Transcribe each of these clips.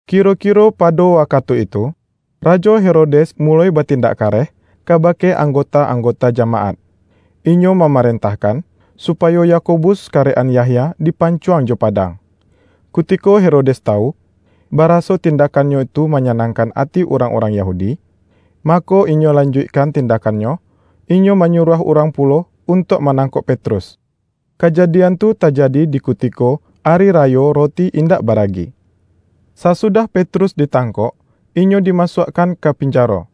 Kiro-kiro pado wakatu itu, Rajo Herodes muloi batindak kareh kabake anggota-anggota jamaat. Inyo mamarentahkan, supayo Yakobus karek-an Yahya dipancuang jo padang. Kutiko Herodes tawu, baraso tindakkannyo tu manyanangkan ati urang-urang Yahudi, mako, inyo lanjuikkan tindakkannyo; inyo manyuruah urang pulo untuak manangkok Petrus. Kajadian tu tajadi di kutiko Ari Rayo Roti Indak Baragi. Sasudah Petrus ditangkok, inyo dimasuakkan ka pinjaro.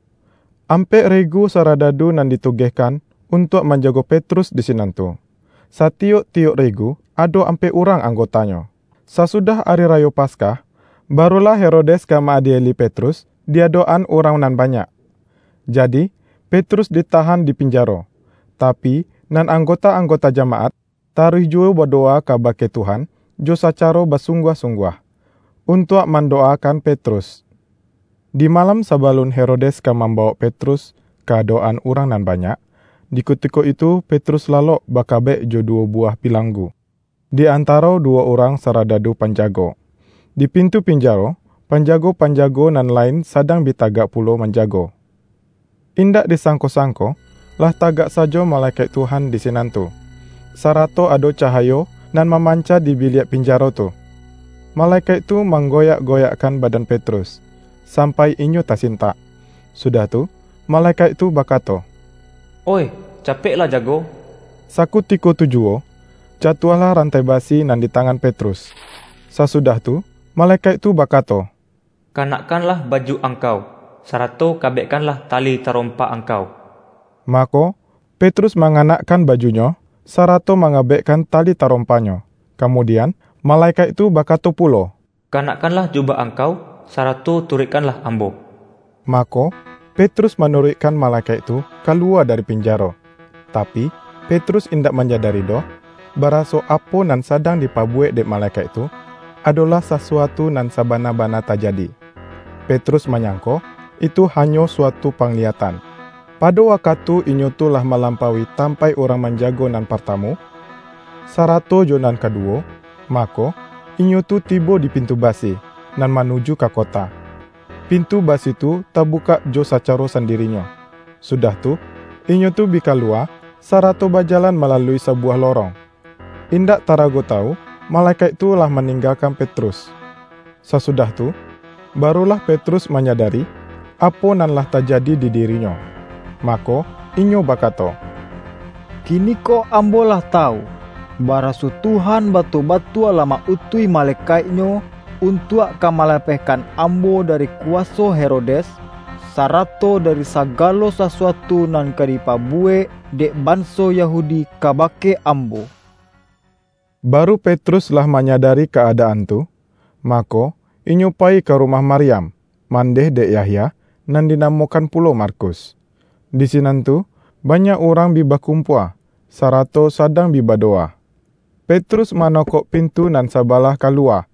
Ampek regu saradadu nan ditugehkan untuak manjago Petrus di sinan tu, — satiyok-tiyok regu ado ampek urang anggotanyo. Sasudah ari rayo Paskah, barulah Herodes ka ma-adieli Petrus di adok-an urang nan banyak. Jadi, Petrus ditahan di pinjaro; tapi, nan anggota-anggota jamaat, taruih juwo badowa kabake Tuhan jo sacaro basungguah-sungguah, untuak mandowakan Petrus. Di malam sabalun Herodes ka mambawok Petrus ka adok-an urang nan banyak, di kutiko itu Petrus lalok bakabek, jo duwo buwah pilanggu, di antaro duwo urang saradadu panjago. Di pintu pinjaro, panjago-panjago nan lain sadang bi tagak pulo manjago. Indak disangko-sangko, lah tagak sajo malekaik Tuhan di sinan tu, sarato ado cahayo nan mamanca di biliak pinjaro tu. Malekaik tu manggoyak-goyakkan badan Petrus, sampai inyo tasintak. Sudah tu, malekaik tu bakato,”Oih, capeklah jago!” Sakutiko tujuwo, jatuahlah rantai basi nan di tangan Petrus. Sasudah tu, malekaik tu bakato,”Kanakkanlah baju angkau, sarato kabekkanlah tali tarompa angkau.” Mako, Petrus manganakkan bajunyo, sarato mangabekkan tali tarompanyo. Kamudian, malekaik tu bakato pulo,”Kanakkanlah jubah angkau, sarato turuikkanlah ambo.” Mako, Petrus manuruikkan malekaik tu kaluwa dari pinjaro. Tapi, Petrus indak manyadari doh, baraso, apo nan sadang dipabuwek dek malekaik tu, adolah sasuatu nan sabana-bana tajadi. Petrus manyangko itu hanyo suatu pangliyatan. Pado wakatu inyo tu lah malampaui tampaik urang manjago nan partamu, sarato jo nan kaduwo, mako, inyo tu tibo di pintu basi, nan manuju ka kota. Pintu basi tu tabukak jo sacaro sandirinyo, sudah tu, inyo tu bi kaluwa, sarato bajalan malalui sabuwah lorong. Indak tarago tawu, malekaik tu lah maninggakan Petrus. Sasudah tu, barulah Petrus manyadari, apo nan lah tajadi di dirinyo, mako, inyo bakato,”Kiniko ambo lah tawu, baraso Tuhan batua-batua lah ma-utuih malekaik-Nyo, untuak ka malapehkan ambo dari kuwaso Herodes, sarato dari sagalo sasuatu nan ka dipabuwek, dek banso Yahudi kabake ambo.” Baru Petrus lah manyadari ka-adaan tu, mako, inyo payi ka rumah Maryam, mandeh dek Yahya, nan dinamokan pulo Markus. Di sinan tu banyak urang bi bakumpua, sarato sadang bi badowa. Petrus manokok pintu nan sabalah kaluwa,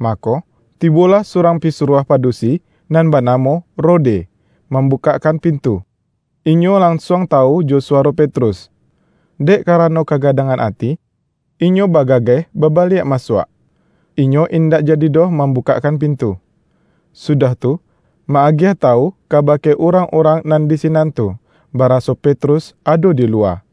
mako, tibolah surang pisuruah padusi nan banamo Rode, mambukakkan pintu. Inyo lansuang tawu jo suwaro Petrus. Dek karano kagadangan ati, inyo bagageh babaliak masuak, inyo indak jadi doh mambukakkan pintu, sudah tu, ma-agiah tawu kabake urang-urang nan di sinan tu, baraso Petrus ado di luwa.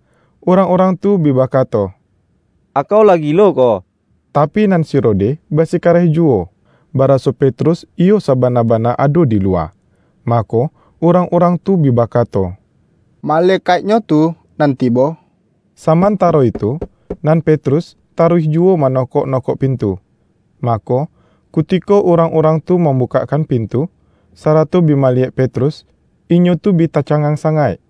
Urang-urang tu bi bakato,”Akau lah gilo ko.” Tapi, nan si Rode basikareh juwo, baraso Petrus iyo sabana-bana ado di luwa. Mako, urang-urang tu bi bakato,”Malekaiknyo tu nan tibo!” Samantaro itu, nan Petrus taruih juwo manokok-nokok pintu. Mako, kutiko urang-urang tu mambukakkan pintu, sarato bi maliyek Petrus, inyo tu bi tacangang sangaik.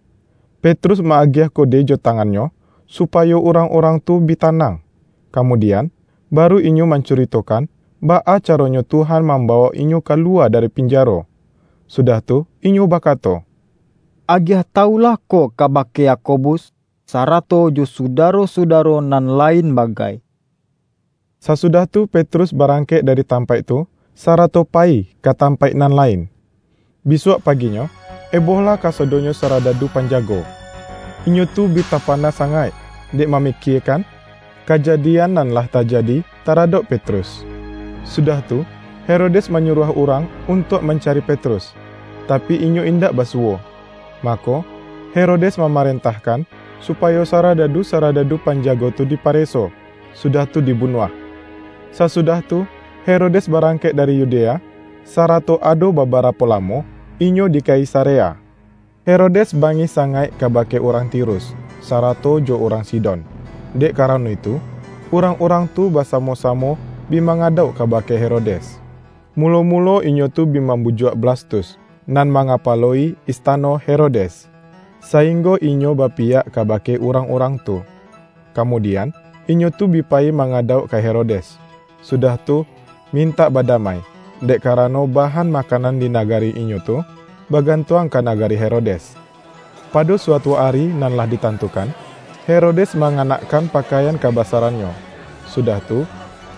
Petrus ma-agiah kode jo tangannyo, supayo urang-urang tu bi tanang, kamudian, baru inyo mancuritokan, baa caronyo Tuhan mambawok inyo kaluwa dari pinjaro. Sudah tu inyo bakato,”Agiah tawu lah ko kabake Yakobus, sarato jo sudaro-sudaro nan lain bagai.” Sasudah tu Petrus barangkek dari tampaik tu, sarato payi ka tampaik nan lain. Bisuak paginyo, ebohlah kasadonyo saradadu panjago. Inyo tu bi tapana sangaik, dek mamikiekan kajadian nan lah tajadi taradok Petrus. Sudah tu, Herodes manyuruah urang untuak mancari Petrus, tapi inyo indak basuwo. Mako, Herodes mamarentahkan, supayo saradadu-saradadu panjago tu dipareso, sudah tu dibunuah. Sasudah tu, Herodes barangkek dari Yudea, sarato ado babarapo lamo, inyo di Kaisarea. Herodes bangih sangaik kabake urang Tirus, sarato jo urang Sidon. Dek karano itu, urang-urang tu basamo-samo bi mangadauk kabake Herodes. Mulo-mulo inyo tu bi mambujuak Blastus, nan mangapalo-i istano Herodes, sainggo inyo bapiyak kabake urang-urang tu. Kamudian, inyo tu bi payi mangadauk ka Herodes, sudah tu mintak badamai, dek karano bahan makanan di nagari inyo tu, bagantuang ka nagari Herodes. Pado suatu ari nan lah ditantukan, Herodes manganakkan pakaian kabasarannyo, sudah tu,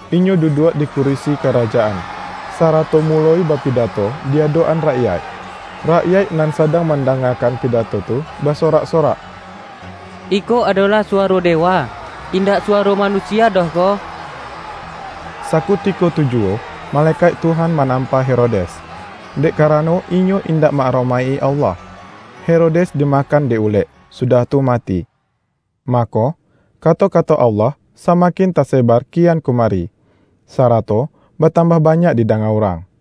inyo duduak di kurisi karajaan, sarato muloi bapidato di adok-an rakyaik. Rakyaik nan sadang mandangakan pidato tu, basorak-sorak,”Iko adolah suwaro dewa, indak suwaro manusia doh ko!” Sakutiko tu juwo malekaik Tuhan manampa Herodes, dek karano inyo indak ma-aromaik-i Allah. Herodes dimakan dek ulek, sudah tu mati. Mako, kato-kato Allah samakin tasebar kian kumari, sarato batambah banyak didanga urang.